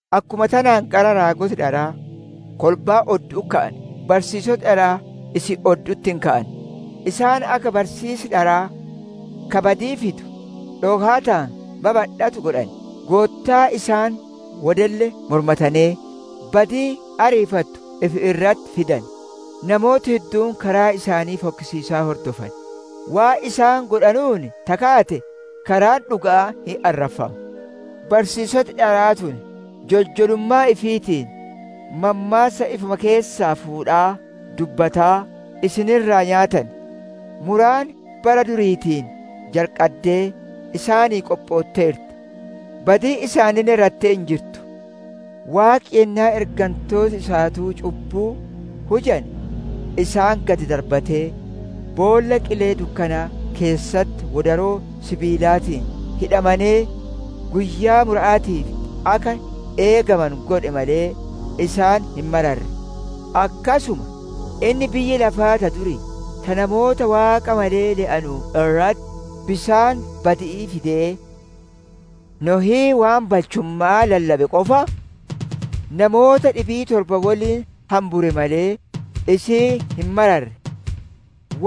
Akkuma tanaan qara raagoti dharaa kolbaa oddu'utti ka'ane, barsiisoti dharaa isin oddu'utti hin ka'an. Isaan akka barsiisi dharaa ka badii fidu dhokaataan babadhatu godhan; Goottaa isaan wodelle mormatanee, badii ariifattuu ifi irratti fidan. Namooti hedduun karaa isaanii fokkisiisaa hordofan; waan isaan godhanuun ta kaate karaan dhuga'aa hin arraffama. Barsiisoti dharaa tun joljolummaa ifiitiin mammaassa ifuma keessaa fuudhaa dubbataa isin irraa nyaatan. Muraan bara duriitiin jalqaddee isaanii qophootteerti. Badiin isaaniille rattee hin jirtu! Waaqi yennaa ergantooti isaatuu cubbuu hujane, isaan gad darbatee, boolla qilee dukkanaa keessatti wodaroo sibiilaatiin hidhamanee, guyyaa mura'aatiif akka eegamanu godhe malee, isaan hin mararre. Akkasuma, Inni biyya lafaa ta durii, ta namoota Waaqa malee le'anuu irratti bisaan badi'ii fidee, Nohii waan balchumma'aa lallabe qofa, namoota dhibii torba woliin hambure malee, isii hin mararre.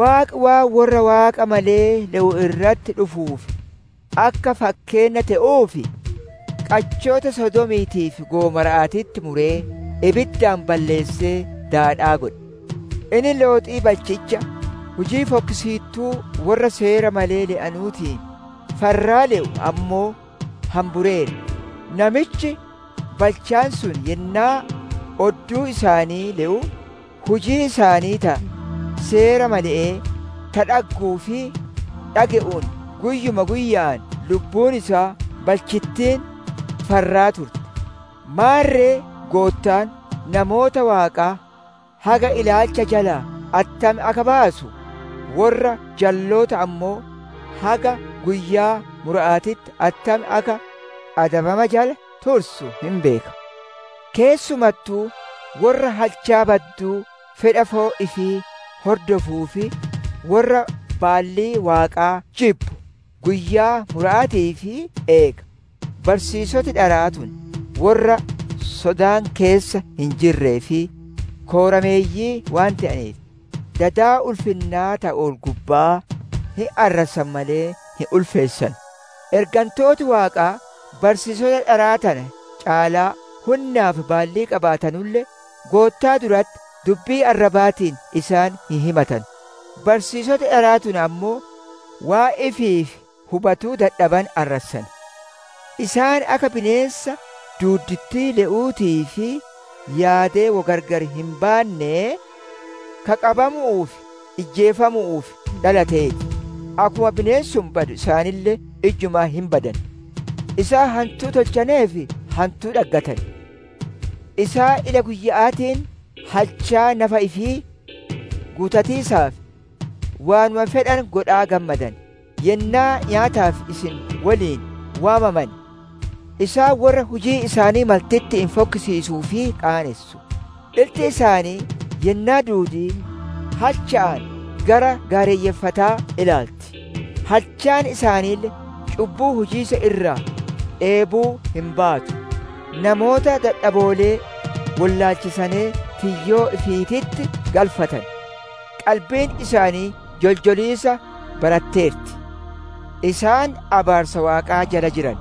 Waaqi waan worra Waaqa malee le'u irratti dhufuuf akka fakkeenna te'uuf, qachoota Sodoomiitii fi Gomora'aatitti muree ibiddaan balleessee daadhaa godhe. Inni Looxii balchicha, hujii fokkisiittu worra seera malee le'uutiin farraa le'u ammoo hambureera. Namichi balchaan sun yennaa odduu isaanii le'u hujii isaanii ta seera male'ee, ta dhagguu fi dhage'uun guyyuma guyya'aan lubbuun isaa balchittiin farraa turte. Maarre Goottaan, namoota Waaqaa haga ilaalcha jalaa attam akka baasu, worra jalloota ammoo haga guyyaa mura'aatitti attam akka adabama jala tursu hin beeka; keessumattuu worra halchaa badduu fedha foon ifii hordofuu fi worra baallii Waaqaa jibbu guyyaa mura'aatiif eega. Barsiisoti dharaa tun worra sodaan keessa hin jirree fi koorameeyyii waan te'aneef, dada ulfinnaa ta ol-gubba'aa hin arrassan malee hin ulfeessanu. Ergantooti Waaqaa, barsiisota dharaa tana caalaa hunnaa fi baallii qabaatanulle, Goottaa duratti dubbii arrabaatiin isaan hin himatanu. Barsiisoti dharaa tun ammoo waan ifiif hubatuu dadhabane arrassan; isaan akka bineensa duuddittii le'uutii fi yaadee wo gargar hin baannee, ka qabamu'uu fi ijjeefamu'uuf dhalatee ti; akkuma bineensi sun badu, isaaniille ijjumaa hin badan. Isaan hantuu tolchaneef hantuu dhaggatan. Isaan ila guyya'aatiin halchaa nafa ifii guutatiisaaf waanuma fedhane godhaa gammadan; yennaa nyaataaf isin woliin waamamane, isaan worra hujii isaanii maltitti'iin fokkisiisuu fi qaanessu. Iltii isaanii yennaa duudii halcha'aan gara gaarayyeeffataa ilaalti; halchaan isaaniille cubbuu hujiisa irraa dheebuu hin baatu. Namoota dadhaboolee wollaalchisanee tiyyoo ifiititti galfatan. Qalbiin isaanii joljoliisa baratteerti. Isaan abaarsa Waaqaa jala jiran!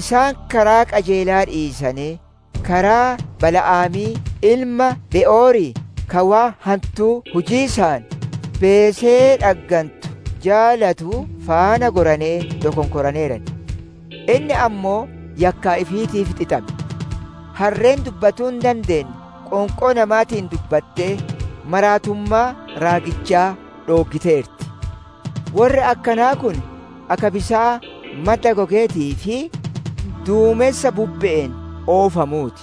Isaan karaa qajeelaa dhiisanee, karaa Bala'aamii ilma Be'orii ka waan hantuu hujiisaan beesee dhaggantu jaalatuu faana goranee dokonkoraneeran. Inni ammoo yakkaa ifiitiif xixame. Harreen dubbatuu hin dandeenne qoonqoo namaatiin dubbattee maraattummaa raagichaa dhooggiteerti. Worri akkanaa kun akka bisaan madda gogeetii fi duumensa bubbe'een oofamuu ti;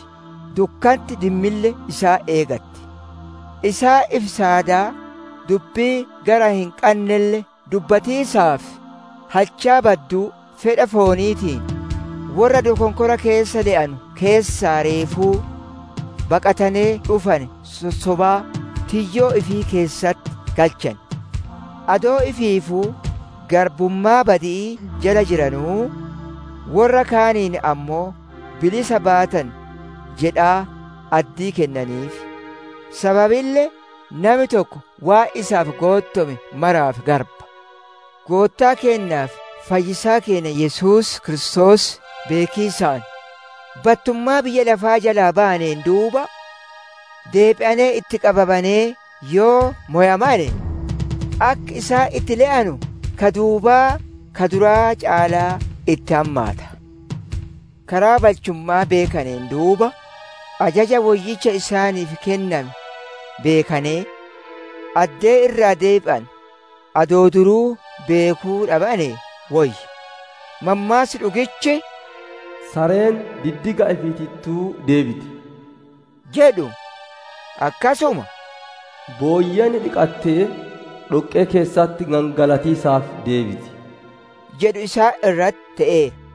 dukkanti dimmille isaan eegatti. Isaan ifi saadaa dubbii gara hin qannelle dubbatiisaaf, halchaa badduu fedha fooniitiin, worra dokonkora keessa le'anu keessaa reefuu baqatanee dhufane sossobaa tiyyoo ifii keessatti galchan. Adoo ifiifuu garbummaa badi'ii jala jiranuu, worra kaaniin ammoo bilisa baatan jedhaa, addii kennaniif; sababille nami tokko waan isaaf goottome maraaf garba. Goottaa keennaa fi fayyisaa keenna Yesuus Kiristoos beekiisaan, battummaa biyya lafaa jalaa bayaneen duuba, deebi'anee itti qabamanee yoo mowamane, akki isaan itti le'anu ka duubaa ka duraa caalaa itti hammaata. Karaa balchumma'aa beekaneen duuba, ajaja woyyicha isaaniif kenname beekanee, addee irraa deebi'anu adoo duruu beekuu dhabanee woyya. Mammaassi dhugichi, «Sareen diddiga ifiitittuu deebiti» jedhu, akkasuma «Booyyeen dhiqatte dhoqqee keessatti gangalatiisaaf deebiti» jedhu isaan irratti te'eera.